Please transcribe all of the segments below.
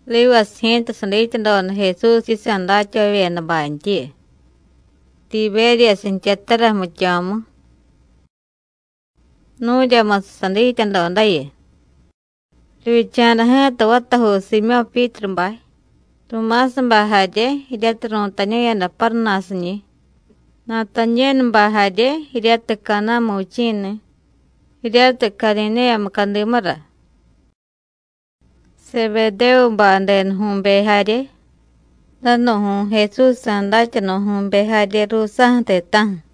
Rivasiy ji̱ta, sadityadoda Jesús yisa̱ datyavavyedabantyiyu, Tibéryasiy jtyatara jmityo̱mu. Nu̱ryamusiy sadityadodayu. Rivyicha̱da ji̱ta vatajuu Siimyó̱ Pyítrubay, Tumásabay jarye jiryatiy ru̱tañu̱yada Páruna̱siñi̱, Natañénubay jarye jiryatiy Caná̱mu vichi̱ni̱, jiryatiy Cadidéya mucadimura; Sebedévubay denuju̱be jarye, danu̱ju̱y Jesúsjsa̱ datyanu̱jyu̱be jarye ruusa̱ju̱ ti̱ta̱ju̱.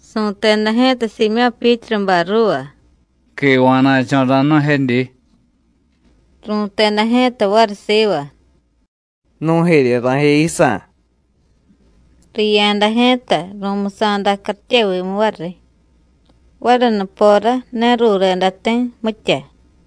Su̱teda ji̱ta Siimyó̱ Pyítrubay ruuva: “Quiva̱na̱cho̱ ra̱jnu̱jedyi.” Ru̱teda ji̱ta variy siva: “Nu̱jerye ra̱jiya yisa̱.” Riya̱da ji̱ta, ru̱musa̱da cartyevimu variy. Variy nupora ne rureda ti̱, mitya.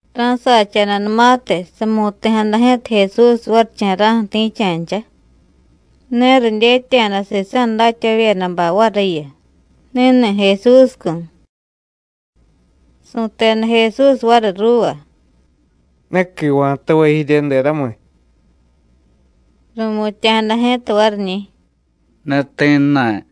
Ra̱sacha̱danumatiy, samu̱ti̱jada ji̱ta Jesús varicha̱ra̱ju̱ ti̱cha̱ncha. Ne ridyetya̱da sisa̱ datyavavyedabay variyu: Ni̱ni̱ Jesúscu̱. Su̱teda Jesús variy ruuva: “¿Ne quiva̱tavay jirye, deramiy?” Ru̱mutya̱jada ji̱ta variñi̱: “Ne ti̱jna̱y.”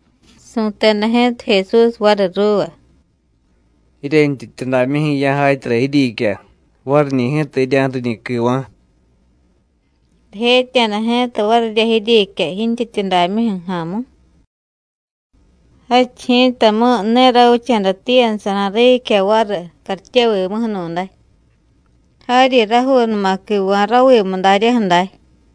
Su̱teda ji̱ta Jesús variy ruuva: “Jiryentyityudamyuju̱ ya̱jatyara jiryiicya, variñi̱ ji̱ta jirya̱ju̱riñi̱ quiva̱.” Rijetya̱da ji̱ta varirya jiryiicya jintyityudamyuju̱ ja̱a̱mu. Jadchiy ji̱tamu̱y ne ravicha̱da tiiyadasa̱ra̱ riicya variy cartyevimuju̱nu̱day, jaryi rajuunuma quiva̱ ravimu daryaju̱ day.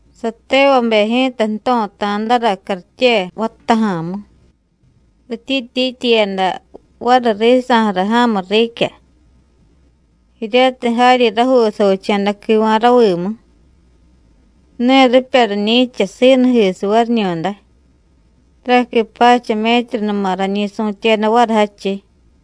Satevabe ji̱ta jto̱ta̱dara cartye vattaja̱a̱mu, rityiityityiyada variy risa̱ju̱ra ja̱mu riicya, jiryatiy jaryi rajuu savicha̱da quiva̱ ravimu. Ne ripya riñi̱cha siinujisiy variñu̱day, taraqui pacha métrunuma rañi su̱tyeda variy jadchiy.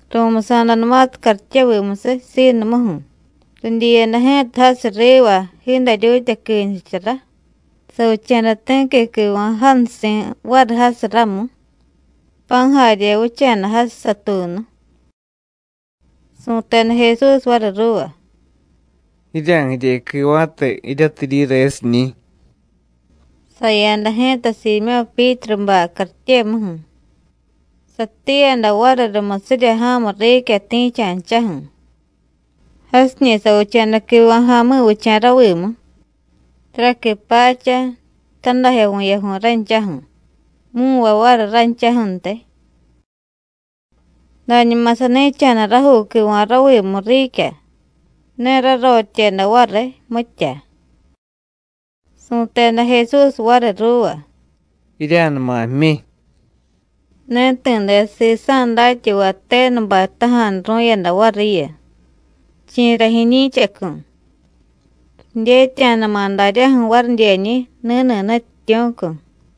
Ru̱musa̱danumatiy caryetvimusiy siinumuju̱, ridyiyada ji̱ta jasiy riva jiidaryuutya quinchusara, savicha̱da ti̱qui quiva̱ jansi̱ variy jasiy ramu, pa̱ jarye vicha̱da jasiy satuunu. Su̱teda Jesús variy ruuva: “Jirya̱jirye quiva̱te jiryatiy jiryiresiñi̱.” Saya̱da ji̱ta Siimyó̱ Pyítrubay cartyemuju̱, satiiyada variy rumusirya ja̱mu riicya ti̱cha̱nchaju̱. Jasiñi̱ savicha̱da quiva̱ ja̱mi̱vicha̱ ravimu, taraqui pacha, tadajyo vu̱yaju̱y ranchaju̱, mu̱nvay variy ranchaju̱ntiy. Dañuma sani̱cha̱da rajuu quiva̱ ravimu riicya, ne rarotyeda variy, mitya. Su̱teda Jesús variy ruuva: “Jirya̱numa jmyi.” Ne ti̱de sisa̱ datyavay tenubay jtaja̱nuru̱yada variyu: Chi̱ra jiñi̱chacu̱, ridyetya̱dama̱ daryaju̱ varidyeñi̱: Ni̱ni̱ Nutyityu̱cu̱.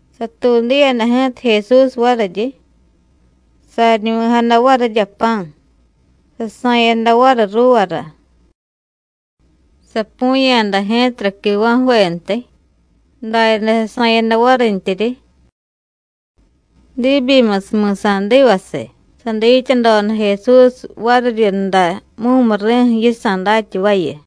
Satuudiyada ji̱ta Jesús variryi, saryiñuvi̱jada varirya pa̱, sasa̱yada variy ruuvara. Sapu̱ya̱da ji̱tara quiva̱ju̱ventiy, daryaday sasa̱yada varintyiryi. Diibyimusiy mi̱sa̱divasiy, sadityadoda Jesús variryunda mumuri̱ju̱ yisa̱ datyavayu.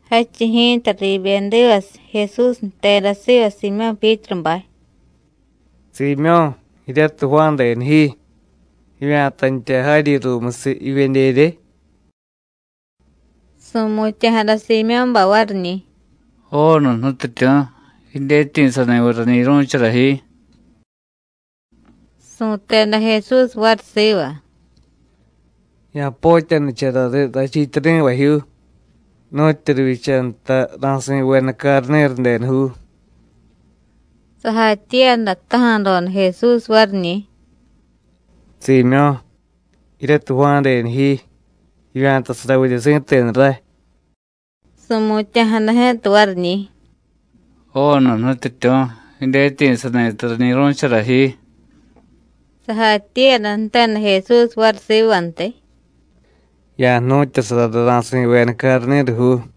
Jadchiy ji̱ta, riibyedivasiy, Jesús jteda siva Siimyó̱ Pyítrubay: “Siimyó̱, jiryatiy Juán denu ji, ¿jivya̱tantya jaryi ruumusiy jivyedyerye?” Su̱mutya̱jada Siimyó̱bay variñi̱: “Joonu, Nutyityu̱, jidyetyi̱sani̱viy rañi̱ru̱chara ji.” Su̱teda Jesús variy siva: “Ya̱potyanicharariy rachiityari̱vajyuu nu̱tyu rivyicha nta ra̱si̱veda carni̱ru denujuu.” Sajatyiiyada jtaja̱doda Jesús variñi̱: “Siimyó̱, jiryatiy Juán denu ji, ¿jivya̱tasaravidye si̱tenu ray?” Su̱mutya̱jada ji̱ta variñi̱: “Joonu, Nutyityu̱, jidyetyi̱sani̱ta rañi̱ru̱chara ji.” Sajatyiiyada jteda Jesús variy sivantiy: “Ya̱jnu̱tyasarariy ra̱si̱veda carni̱rujuu.”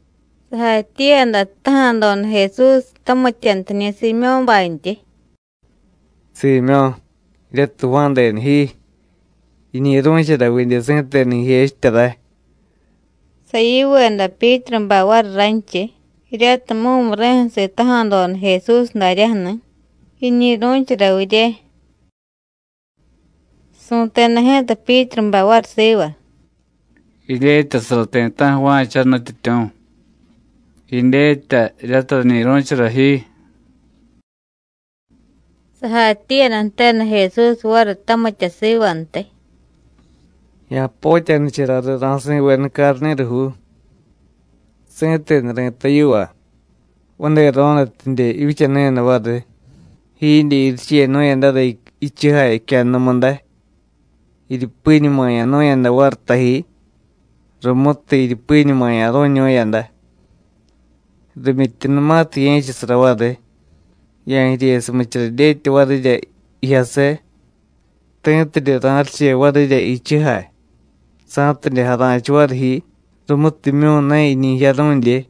Sajatyiiyada jtaja̱doda Jesús tamityantiñi̱ Siimyó̱bantyi: “Siimyó̱, jiryatiy Juán denu ji, ¿jiñi̱ru̱chara vidye si̱tenu jijechitya ray?” Sayiveda Pyítrubay variy ranchiy, jiryatiy mumuri̱ju̱ sitaja̱doda Jesús daryaju̱ni̱: Jiñi̱ru̱chara virye. Su̱teda ji̱ta Pyítrubay variy siva: “Jidyetyasara ti̱ta̱ju̱ va̱cha, Nutyityu̱. Jidyetya jiryatiy rañi̱ru̱chara ji.” Sajatyiiyada jteda Jesús variy tamitya sivantiy: “Ya̱potyanicharariy ra̱si̱veda carni̱rujuu. Si̱tenu ri̱tay yiva: Vadero̱nutidye jivyichanu̱yada variy, jiidye jirichenu̱yadara jichujay jicyannumu day, jiryupiñumaya̱nu̱yada variy taji, rumutiy jiryupiñumaya̱ru̱ñu̱yada. Rimyityunumatiy ye̱chasara variy, ya̱jiryesumichara dyetya varirya jijyase, ti̱tidye ra̱riche varirya jichujay, sa̱tidye jara̱chiy variy ji rumutimyu̱ ne jiñi jiyaru̱dye.”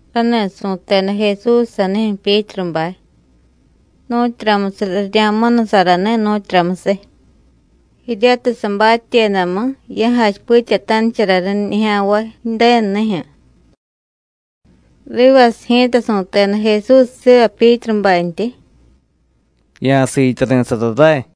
Rani̱ su̱teda Jesús sanijyu̱ Pyítrubay, nu̱tyuramusiy rirya̱munusarani̱, nu̱tyuramusiy, jiryatiy sabatyedamu ya̱jachipityatanicharariy nijya̱nvay Ju̱denu nijyu̱. Rivasiy ji̱ta su̱teda Jesús siva Pyítrubantyi: “Ya̱siityari̱sara ray.”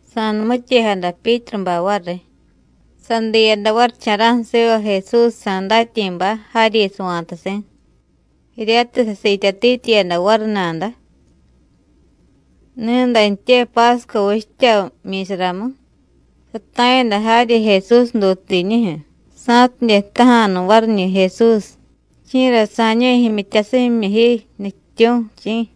Sa̱numityejada Pyítrubay variy, sadiyada varicha̱ra̱ju̱ siva Jesúsjsa̱ datyi̱bay, jaryi sava̱tasi̱, jiryatiy sasiityatityiyada variy nada. Ni̱dantye Pásco vichtya jmyi̱saramu sata̱yada jaryi Jesús dutuudinijyu̱, sa̱tidye jtaja̱nu variñi̱ Jesús: “¿Chi̱ra sa̱ñu̱y jimyityasimyimyu ji, Nutyityu̱, chi̱?”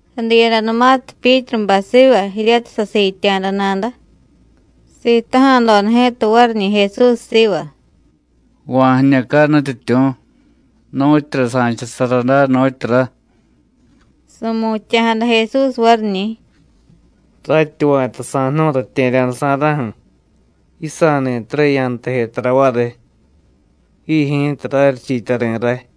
Sadiyadanumatiy Pyítrubay siva jiryatiy sasiitya̱da nada, sitaja̱doda ji̱ta variñi̱ Jesús siva: “¿Va̱ jiñucay, Nutyityu̱, nu̱tyura sa̱chasara day, nu̱tyura?” Su̱mutya̱jada Jesús variñi̱: “Ratyi va̱ta sa̱jnu̱y ratye̱rya̱dasa̱ra̱ju̱, yisa̱ ni̱tara yantaje tara variy. Ji ji̱ta raryichiityari̱ ray.”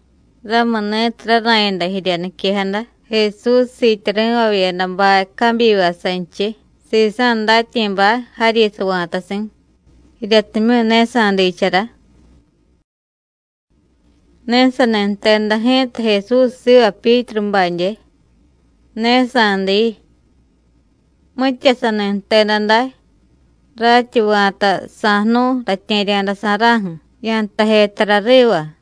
Ramuni̱tiy rara̱yada jirya niquejada Jesús siityari̱vavyedabay cabyiva sanchiy sisa̱ datyi̱bay jaryi sava̱tasi̱, jiryatimyu̱ ne sa̱diichara. Ne sani jteda ji̱ta Jesús siva Pyítrubadye: “Ne sa̱diiy.” Mitya sani jteda day: “Ratyi va̱ta sa̱jnu̱y ratye̱rya̱dasa̱ra̱ju̱, yantaje tara riva.”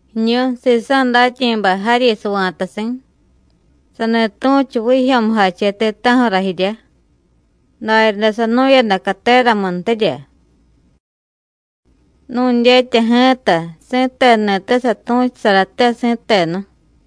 Jiñu sisa̱ datyi̱bay jaryi sava̱tasi̱, sani tu̱chu vijyo̱mujache ti̱ta̱ju̱ra jiryá, daryaday sanu̱yada cateramuntirya. Nu̱dyetya ji̱ta si̱tenuni̱te satu̱chusarate, si̱tenu.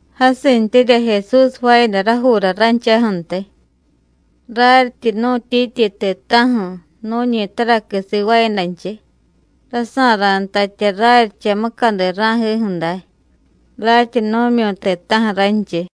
Jasintyirya Jesús jvaayada rajuura ranchaju̱ntiy. Raryityi nu̱tyityi ti̱ta̱ju̱ nu̱ñi taraqui sivaayadanchiy, rasa̱ra̱ntatya raryicha mucadi ra̱jiju̱ day, ratyi nu̱myu̱y ti̱ta̱ju̱ ranchiy.